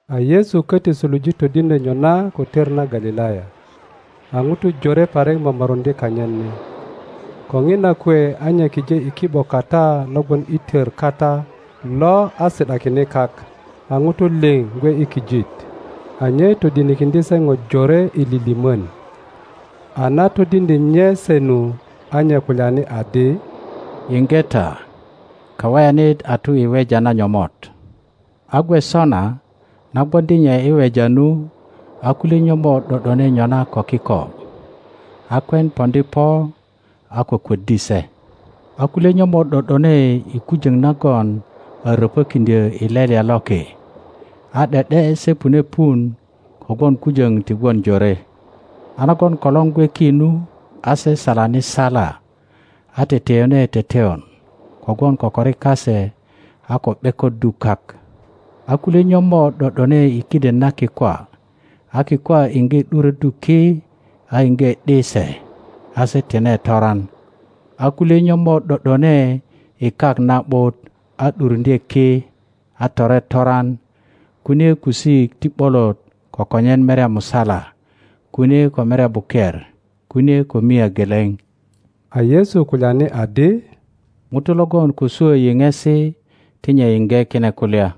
A Yesu köti suluje todiŋdyö nyona ko tör na Galilaya. A ŋutu jore parik momoruŋdye kanyit ni, ko ŋina kwe a nye kije i ki ’bo kata lo gwon i tör kata lo a si ’dakine kak, a ŋutu liŋ gwe i kijit. A nye todinikiŋdye se ŋo jore i lilimön.A na todiŋdye nye se nu, a nye kulyani adi, Yiŋge ta! Kaweyanit a tu i weja na nyomot. A gwe sona, na gwoŋdi nye i weja nu, a kulye nyomot ’do ’done nyona ko kiko, a kwen poŋdi po a kwökwöddi se. A kulye nyomot ’do ’done i kujöŋ nagon a röpökiŋdyö i lelya loki, a ’de ’de se pune pun kogwon kujöŋ ti gwon jore; a nagon kolor gwe ki nu, a se salani sala, a teteyone teteyon kogwon kokori kase a ko ’bekoddu kak. A kulye nyomot ’do ’done i kiden na kikwa, a kikwa iŋge ’duröddu ki a iŋge ’di se, a se tine toran. a kulye nyomot ’do ’done i kak na ’but a ’duruŋdye ki, a tore toran, kunie kusik ti ’bolot ko konyen merya musala, kunie ko merya buker, kunie ko mia geleŋ. A Yesu kulyani adi, ŋuto logon ko swö yiŋesi ti nye yiŋge kine kulya.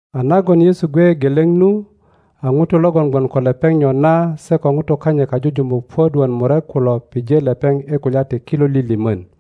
A nagon Yesu gwe geleŋ nu, a ŋutu logon gwon ko lepeŋ nyona se ko ŋutu kanyit kajujumuk puök wot murek kulo pije lepeŋ i kulya ti kilo lilimön.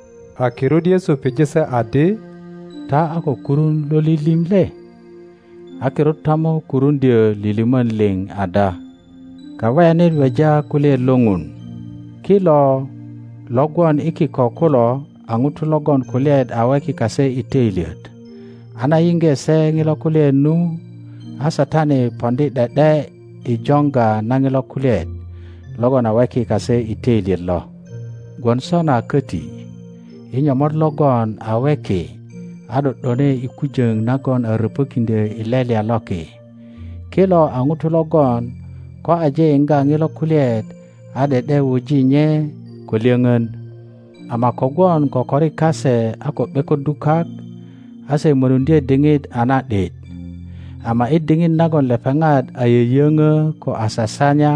A kirut Yesu pije se adi, Ta a ko kurun lo lilim le? A kirut ta mo kurundyö lilimön liŋ ada? Kaweyanit weja kulyaet lo Ŋun. Kilo lo gwon i kiko kulo a ŋutu logon kulyaet a weki kase i töilyet, a na yiŋge se ŋilo kulyaet nu, a Satani poŋdi ’de ’de i joŋga na ŋilo kulyaet logon a weki kase i töilyet lo. Gwon sona köti i nyomot logon a weki a ’do ’done i kujöŋ nagon a röpökiŋdyö i lelya loki, kilo a ŋutu logon ko aje yiŋga ŋilo kulyaet a ’de ’de wuji nye ko lyöŋön; ama kogwon kokori kase a ko ’bekoddu kak, a se mönuŋdye diŋit a na ’dit, ama i diŋit nagon lepeŋat a yöyöŋö ko a sasanya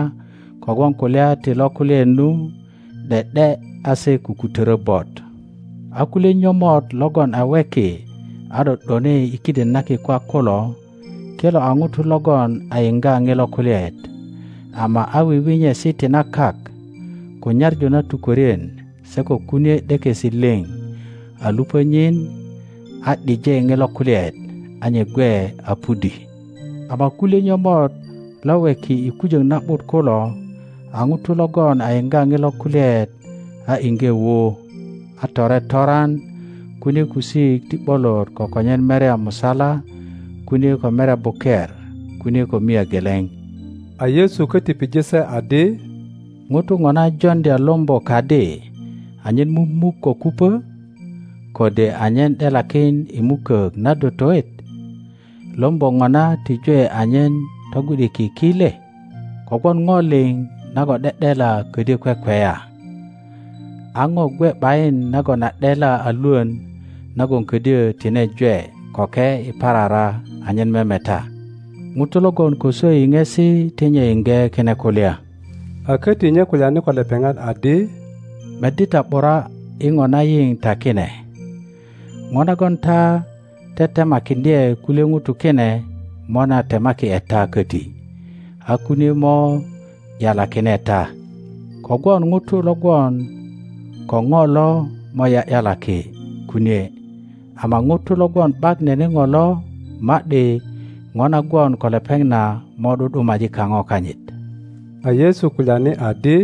kogwon kulya ti lo kulyaet nu, ’de ’de a se kukutörö bot. A kulye nyomot logon a weki a ’do ’done i kiden na kikwa kulo, kilo a ŋutu logon a yiŋga ŋilo kulyaet, ama a wiwinyesi ti na kak, ko nyaŋu na tukwörien, se ko kunie ’dekesi liŋ a lupö nyin, a ’dije ŋilo kulyaet, a nye gwe a pudi. Ama kulye nyomot lo weki i kujöŋ na ’but kulo a ŋutu logon a yiŋga ŋilo kulyaet a iŋge wu, a tore toran, kunie kusik ti ’bolot ko konyen merya musala, kunie ko merya buker, kunie ko mia geleŋ. Lombo mumukö ko kupö? A Yesu köti pije se adi, ŋuto ŋona joŋdya lombo kadi anyen mumuk ko kupö? Kode anyen ’delakin i mukök na dotoet? Lombo ŋona ti jwe anyen togwi ’diki ki le? Kogwon ŋo liŋ nagon ’de ’dela ködyö kwekweya, a ŋo gwe ’bayin nagon a ’dela a lwön nagon ködyö tine jwe köke i parara anyen memeta. ŋuto logon ko swö yiŋesi ti nye yiŋge kine kulya. A köti nye kulyani ko lepeŋat adi, Meddi ta ’bura i ŋo na yiŋ ta kine; ŋo nagon ta tetemakiŋdye kulye ŋutu kine mo na temaki ’e ta köti, a kunie mo ’yalakine ta. Kogwon ŋuto lo gwon ko ŋo lo mo ’ya ’yalaki kunie, ama ŋuto logon ’bak nene ŋo lo, ma ’di ŋo na gwon ko lepeŋ na mo ’du ’dumaji kaŋo kanyit. A Yesu kulyani adi,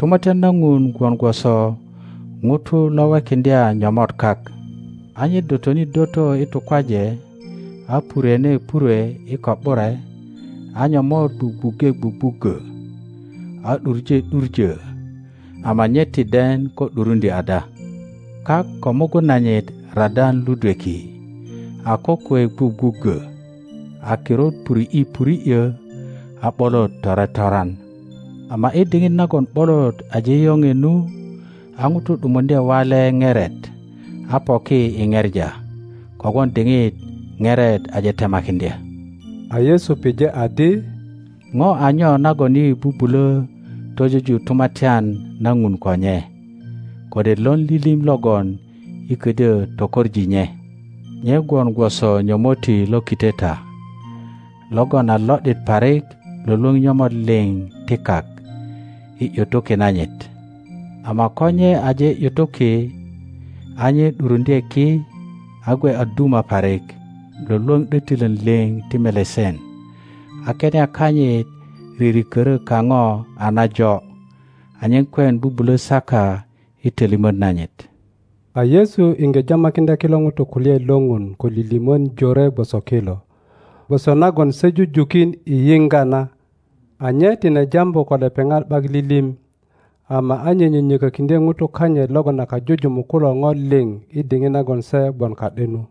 Tumatyan na Ŋun gwon gwoso ŋuto lo wekiŋdya nyomot kak, a nye dotoni doto i tukwaje, a purwene purwe i ko ’bure, a nyomot gwugwuŋge gwugwuggö a ’duŋe ’duŋö, ama nye ti den ko ’duruŋdyö ada. Kak ko mugun nanyit radan ludweki, a kokwe gwugwuggö, a kirut puri ’ye puri ’yö, a ’bolot tore toran. Ama i diŋit nagon ’bolot aje yoŋe nu, a ŋuto ’dumuŋdye wale ŋeret a poki i ŋepa, kogwon diŋit ŋeret aje temakiŋdya. A Yesu pije adi, Ŋo a nyo nagon yi bubulö tojoju Tumatyan na Ŋun ko nye? Kode lon lilim logon yi ködyö tokoŋ nye? Nye gwon gwoso nyomotti lo kiteta, logon a lo ’dit parik lwölwöŋ nyomot liŋ ti kak i ’yutuki nanyit. Ama ko nye aje ’yutuki a nye ’duruŋdye ki a gwe a duma parik lwölwöŋ ’dötilön liŋ ti melesen, a kenia kanyit ririkörö kaŋo a najo, anyen kwen bubulö saka i tölimöt nanyit. A Yesu iŋge jamakiŋdya kilo ŋutu kulyaet lo Ŋun ko lilimön jore gwoso kilo, gwoso nagon se jujukin i yiŋga na; a nye tine jambu ko lepeŋat ’bak lilim, ama a nye nyönyökökiŋdye ŋutu kanyit logon a kajujumuk kulo ŋo liŋ i diŋit nagon se gwon ka ’de nu.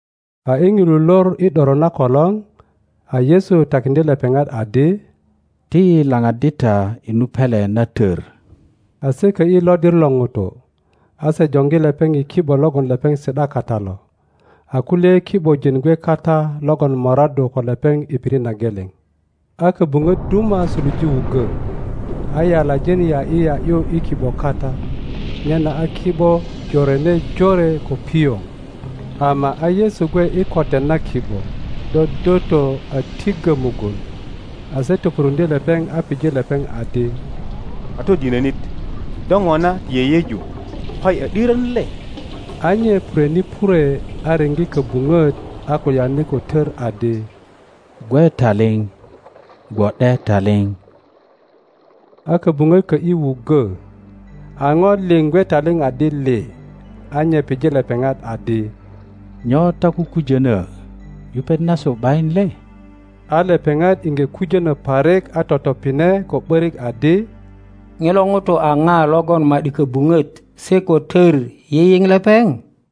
A i ŋilu lor i ’doro na kolor, a Yesu takiŋdye lepeŋat adi, Ti yi laŋaddi ta i nu pele na tor. a se kö ’yi lodir lo ŋutu, a se joŋgi lepeŋ i ki ’bo logon lepeŋ si ’da kata lo, a kulye ki ’bojin gwe kata logon moraddu ko lepeŋ i pirit na geleŋ. a kobuŋot duma suluje wuggo, a yalajin ya ’yi ya ’yu i ki ’bo kata, nyena a ki ’bo jorene jore ko pioŋ. Ama a Yesu gwe i kotet na ki ’bo, dodoto a tiŋgo mugun; a se topuruŋdye lepeŋ a pije lepeŋ adi, Katodinönit, do ŋona ti yeyeju koyi a ’dirön le? A nye purwene purwe, a riŋge kobuŋot, a kulyani ko tör adi, Gwe taliŋ! Gwo ’de taliŋ! A kobuŋot kö ’yi wuggo, a ŋo liŋ gwe taliŋ adi lii. a nye pipije lepeŋat adi, Nyo ta kukujönö? Yupet nasu ’bayin le? a lepeŋat iŋge kujönö parik a totopine ko ’borik adi, Ŋilo ŋuto a ŋa logon ma ’di köbuŋöt se ko tör yiyiŋ lepeŋ?